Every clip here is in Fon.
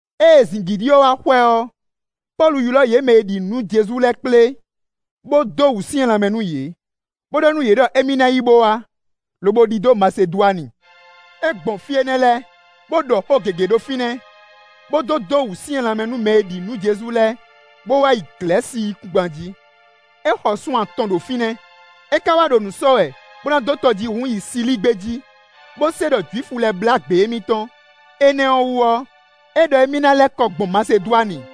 Ée zǐngídi ɔ́ wá xwɛ ɔ́, Pɔ́lu ylɔ́ yě mɛ e ɖi nǔ nú Jezu lɛ́ɛ kplé, bó dó wǔsyɛ́n lanmɛ nú yě, bó ɖɔ nú yě ɖɔ émí ná yi bó wá, lobo ɖidó Masedwani. É gbɔn fí énɛ́ lɛ́ɛ, bó ɖɔ xó gěgé ɖo fínɛ́, bó dó dó wǔsyɛ́n lanmɛ nú mɛ e ɖi nǔ nú Jezu lɛ́ɛ, bó wá yi Glɛ̌si yíkúngban jí. É xɔ sun atɔn ɖo fínɛ́; é ka wá ɖo nǔ sɔ́ wɛ bó ná dó tɔjíhún yi Silíi gbé jí, bó se ɖɔ Jwifu lɛ́ɛ blá gbě émítɔn; énɛ́ ɔ́ wú ɔ́, é ɖɔ émí ná lɛ́ kɔ gbɔn Masedwani.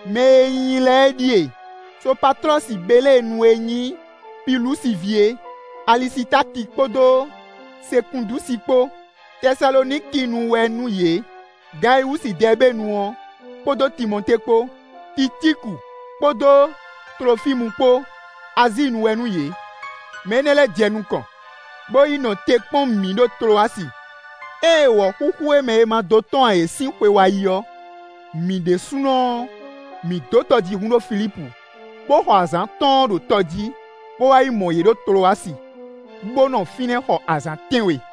Mɛ e nyi i lɛ́ɛ ɖíe: Sopatlɔ́si Beléenu e nyí Pilusi ví é; Alisitáki kpódó Sekúndúsi kpó, Tɛsalonikinu wɛ nú yě; Gayiwúsi Dɛɛbenu ɔ́, kpódó Timɔtée kpó; Ticíku kpódó Tlofímu kpó, Azíinu wɛ nú yě. Mɛ énɛ́ lɛ́ɛ jɛ nukɔn, bó yi nɔ te kpɔ́n mǐ ɖo Tlowasi. Ée wɔ̌xúxú e mɛ è ma dó tɔ́n ǎ é sín xwe wá yi ɔ́, mǐ ɖésúnɔ ɔ́, mǐ dó tɔjíhún ɖo Filípu, bó xɔ azǎn atɔ́ɔ́n ɖo tɔ jí, bó wá mɔ yě ɖo Tlowasi, bó nɔ fínɛ́ xɔ azǎn tɛ́nwe.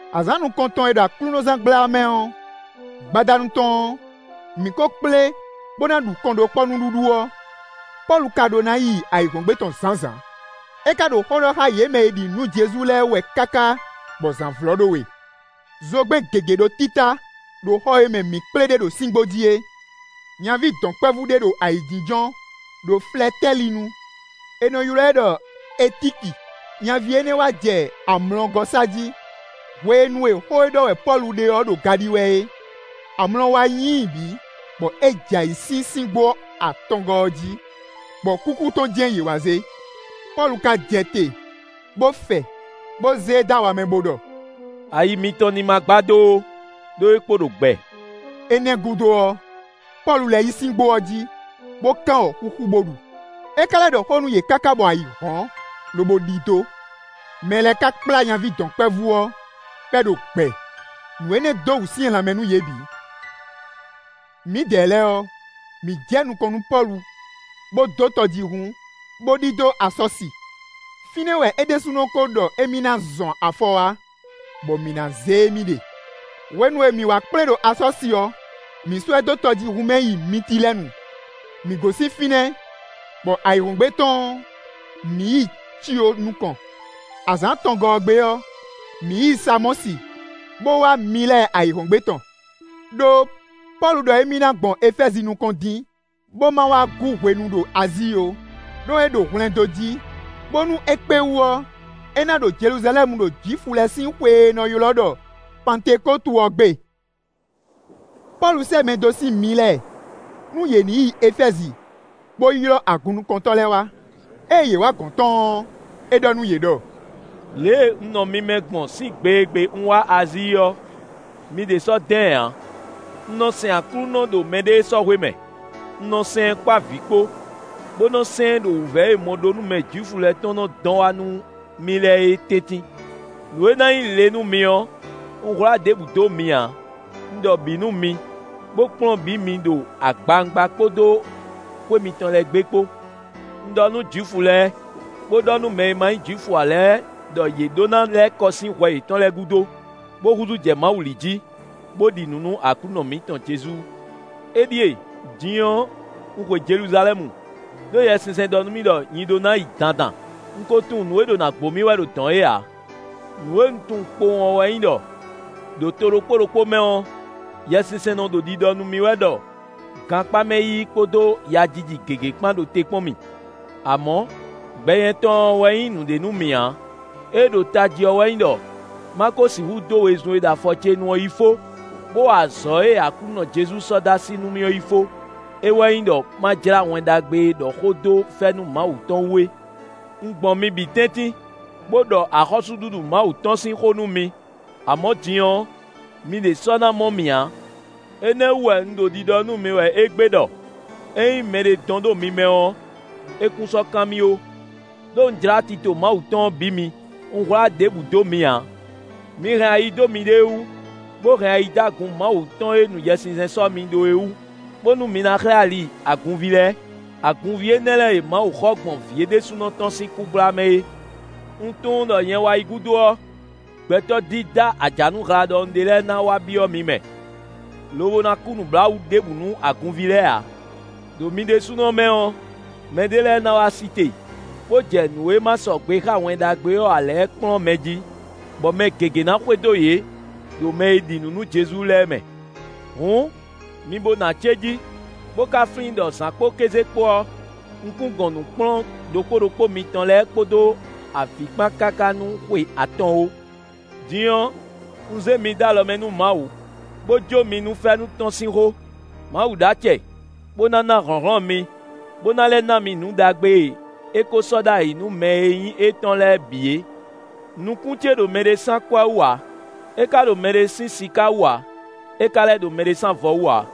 Azǎn nukɔntɔn e ɖo aklúnɔzángbla mɛ ɔ́, gbadanu tɔn ɔ́, mǐ kó kplé bó ná ɖu kɔnɖókpɔ́ nǔɖuɖu ɔ́; Pɔ́lu ka ɖó ná yi ayǐhɔ́ngbe tɔn zǎnzǎn; é ka ɖo xó ɖɔ xá yě mɛ e ɖi nǔ nú Jezu lɛ́ɛ wɛ káká bɔ zǎn vlɔ́ ɖó we. Zogbɛ́n gěgé ɖo títá ɖo xɔ e mɛ mǐ kplé ɖe ɖo síngbó jí é. Nyaví dɔ̌nkpɛvú ɖé ɖo ayǐjínjɔ́n ɖo flɛtɛ́li nu; è nɔ ylɔ́ ɛ ɖɔ Etíki. Nyaví énɛ́ wá jɛ amlɔgɔ́ sa jí, hwenu e xó e ɖɔ wɛ Pɔ́lu ɖe ɔ́ ɖo ga ɖi wɛ é. Amlɔ wá nyí i bǐ, bɔ é jɛ ayǐ sín síngbó atɔngɔ́ ɔ́ jí, bɔ kúkú tɔn jɛ́n yě wá zé. Pɔ́lu ka jɛ te, bó fɛ, bó zé e dó awa mɛ bó ɖɔ: “Ayi mitɔn ní ma gbadó ó, ɖó é kpo ɖo gbɛ.” Énɛ́ gúdo ɔ́, Pɔ́lu lɛ́ yi síngbó ɔ́ jí, bó kán wɔ̌xúxú bó ɖu. É ka lɛ́ ɖɔ xó nú yě káká bɔ ayǐ hɔ́n, lobo ɖidó. Mɛ lɛ́ɛ ka kplá nyaví dɔ̌nkpɛvú ɔ́, bɔ é ɖo gbɛ; nǔ énɛ́ dó wǔsyɛ́n lanmɛ nú yě bǐ. Mǐdɛɛ lɛ́ɛ ɔ́, mǐ jɛ nukɔn nú Pɔ́lu, bó dó tɔjíhún, bó ɖidó Asɔ́si; fínɛ́ wɛ é ɖésúnɔ kó ɖɔ émí ná zɔn afɔ wá, bɔ mǐ ná zé émí ɖe. Hwenu e mǐ wá kplé ɖo Asɔ́si ɔ́, mǐ sɔ́ ɛ dó tɔjíhún mɛ yi Mitilɛ́nu. Mǐ gosín fínɛ́, bɔ ayǐhɔ́ngbe tɔn ɔ́, mǐ yi Cio nukɔn. Azǎn atɔngɔ́ ɔ́ gbe ɔ́, mǐ yi Samɔ́si, bó wá Milɛ ayǐhɔ́ngbe tɔn. Đó Pɔ́lu ɖɔ émí ná gbɔn Efɛ́zi nukɔn dín, bó ma wá gú hwenu ɖo Azíi ó; ɖó é ɖo hwlɛndó jí, bónú é kpé wú ɔ́, é ná ɖo Jeluzalɛ́mu ɖo Jwifu lɛ́ɛ sín xwe e è nɔ ylɔ́ ɖɔ Pantekótu ɔ́ gbe. Pɔ́lu sɛ́ mɛ dó sín Milɛ, nú yě ní yi Efɛ́zi, bó yi ylɔ́ agunnukɔntɔ́ lɛ́ɛ wá. Ée yě wǎ gɔ̌n tɔn ɔ́, é ɖɔ nú yě ɖɔ: “Lě e un nɔ mi mɛ gbɔn sín gbe e gbe un wá Azíi ɔ́, mi ɖě sɔ́ dán ɛ ǎ. Un nɔ sɛn Aklúnɔ ɖo mɛɖée sɔ́ hwe mɛ; un nɔ sɛn ɛ kpó avǐ kpó, bó nɔ́ sɛn ɛ ɖo wǔvɛ́ e mɔɖónúmɛ Jwifu lɛ́ɛ tɔn nɔ dɔn wá nú mì lɛ́ɛ é tɛ́ntin. Nǔ e ná nyí le nú mi ɔ́, un hwlá ɖěbǔ dó mi ǎ: un ɖɔ bǐ nú mi, bó kplɔ́n bǐ mi ɖo agbawungba kpódó xwé mitɔn lɛ́ɛ gbe kpó. Un ɖɔ nú Jwifu lɛ́ɛ, bó ɖɔ nú mɛ e ma nyí Jwifu ǎ lɛ́ɛ ɖɔ yě ɖó ná lɛ́ kɔ sín hwɛ yětɔn lɛ́ɛ gúdo, bó húzú jɛ Mawu li jí, bó ɖi nǔ nú Aklúnɔ mǐtɔn Jezu. Éɖíe! Din ɔ́, un xwe Jeluzalɛ́mu; ɖó Yɛsinsɛn ɖɔ nú mì ɖɔ nyi ɖó ná yi dandan; un ko tunwun nǔ e ɖo ná gbo mì wɛ ɖo dɔ̌n é ǎ. Nǔ e un tunwun kpowun ɔ́ wɛ nyí ɖɔ: ɖo to ɖokpó ɖokpó mɛ ɔ́, Yɛsinsɛn nɔ ɖo ɖiɖɔ nú mì wɛ ɖɔ gankpá mɛ yiyi kpódó yajiji gěgé kpán ɖo te kpɔ́n mì. Amɔ̌, gbɛ nyɛtɔn ɔ́ wɛ nyí nǔɖé nú mì ǎ; éé ɖo tají ɔ́ wɛ nyí ɖɔ má kó sixú dó wezun e ɖo afɔ ce nu ɔ́ yi fó, bó wa azɔ̌ e Aklúnɔ Jezu sɔ́ dó así nú mì ɔ́ yi fó; é wɛ nyí ɖɔ má jlá Wɛn Ɖagbe e ɖɔ xó dó fɛ́nú Mawu tɔn wú é. “Un gbɔn mi bǐ tɛ́ntin, bó ɖɔ axɔ́súɖuɖu Mawu tɔn sín xó nú mi; amɔ̌ din ɔ́, mi ɖě sɔ́ ná mɔ mì ǎ. Énɛ́ wú wɛ un ɖo ɖiɖɔ nú mi wɛ égbé ɖɔ ényí mɛɖé dɔn ɖo mi mɛ ɔ́, é kún sɔ́ kan mì ó! Đó un jlá tito Mawu tɔn ɔ́ bǐ mi; un hwlá ɖěbǔ dó mi ǎ. Mi hɛn ayi dó miɖée wú, bó hɛn ayi dó agun Mawu tɔn e nu Yɛsinsɛn sɔ́ mi ɖó é wú, bónú mi ná xlɛ́ ali agunví lɛ́ɛ; agunví énɛ́ lɛ́ɛ e Mawu xɔ gbɔn Vǐ é ɖésúnɔ tɔn sín kú gbla mɛ é. Un tunwun ɖɔ nyɛ wá yi gúdo ɔ́, gbɛtɔ́ dídá ajanuhla ɖɔhun ɖé lɛ́ɛ na wá byɔ́ mi mɛ, lobo na kú nǔbláwǔ ɖěbǔ nú agunví lɛ́ɛ ǎ. Đo mi ɖésúnɔ mɛ ɔ́, mɛɖé lɛ́ɛ na wá sí te, bó jɛ nǔ e ma sɔgbe xá Wɛn Ɖagbe ɔ́ ǎ lɛ́ɛ kplɔ́n mɛ jí, bɔ mɛ gěgé ná xwedó yě ɖo mɛ e ɖi nǔ nú Jezu lɛ́ɛ mɛ. Hǔn, mi bo nɔ acéjí, bó ka flín ɖɔ zǎn kpódó kéze kpo ɔ́, un kún gɔn nǔ kplɔ́n ɖokpó ɖokpó mitɔn lɛ́ɛ kpódó avǐ kpán káká nú xwe atɔn ó. “Din ɔ́, un zé mi dó alɔ mɛ nú Mawu, bó jó mi nú fɛ́nú tɔn sín xó. Mawu ɖó acɛ, bó ná na hlɔ̌nhlɔ́n mi, bó ná lɛ́ na mi nǔ ɖagbe e é ko sɔ́ ɖ'ayǐ nú mɛ e nyí étɔn lɛ́ɛ bǐ é. Nukún ce ɖo mɛɖé sín akwɛ́ wú ǎ; é ka ɖo mɛɖé sín siká wú ǎ; é ka lɛ́ ɖo mɛɖé sín avɔ wú ǎ.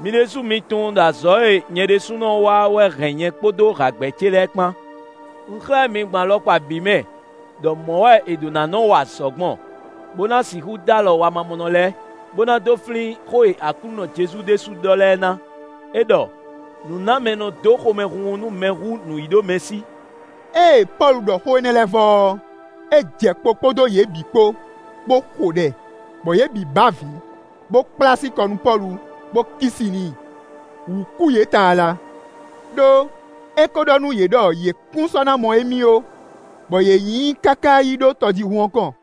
Mi ɖésú mi tunwun ɖɔ azɔ̌ e nyɛ ɖésúnɔ wa ɔ́ wɛ hɛn nyɛ kpódó hǎgbɛ́ ce lɛ́ɛ kpán. Un xlɛ́ mi gbɔn alɔkpa bǐ mɛ ɖɔ mɔ̌ wɛ è ɖǒ ná nɔ́ wa azɔ̌ gbɔn, bó ná sixú dó alɔ wamamɔnɔ lɛ́ɛ, bó ná dó flín xó e Aklúnɔ Jezu ɖésú ɖɔ lɛ́ɛ ná; é ɖɔ: ‘Nǔnámɛ nɔ dó xomɛhunhun nú mɛ hú nǔyíɖomɛsí.’” Ée Pɔ́lu ɖɔ xó énɛ́ lɛ́ɛ vɔ ɔ́, é jɛ kpo kpódó yě bǐ kpó, bó xo ɖɛ; bɔ yě bǐ bɛ́ avǐ, bó kplá así kɔ nú Pɔ́lu, bó kí si n'i. Wǔ kú yě tlala, ɖó é kó ɖɔ nú yě ɖɔ yě kún sɔ́ ná mɔ émí ó, bɔ yě nyi i káká yi ɖó tɔjíhún ɔ́ kɔn.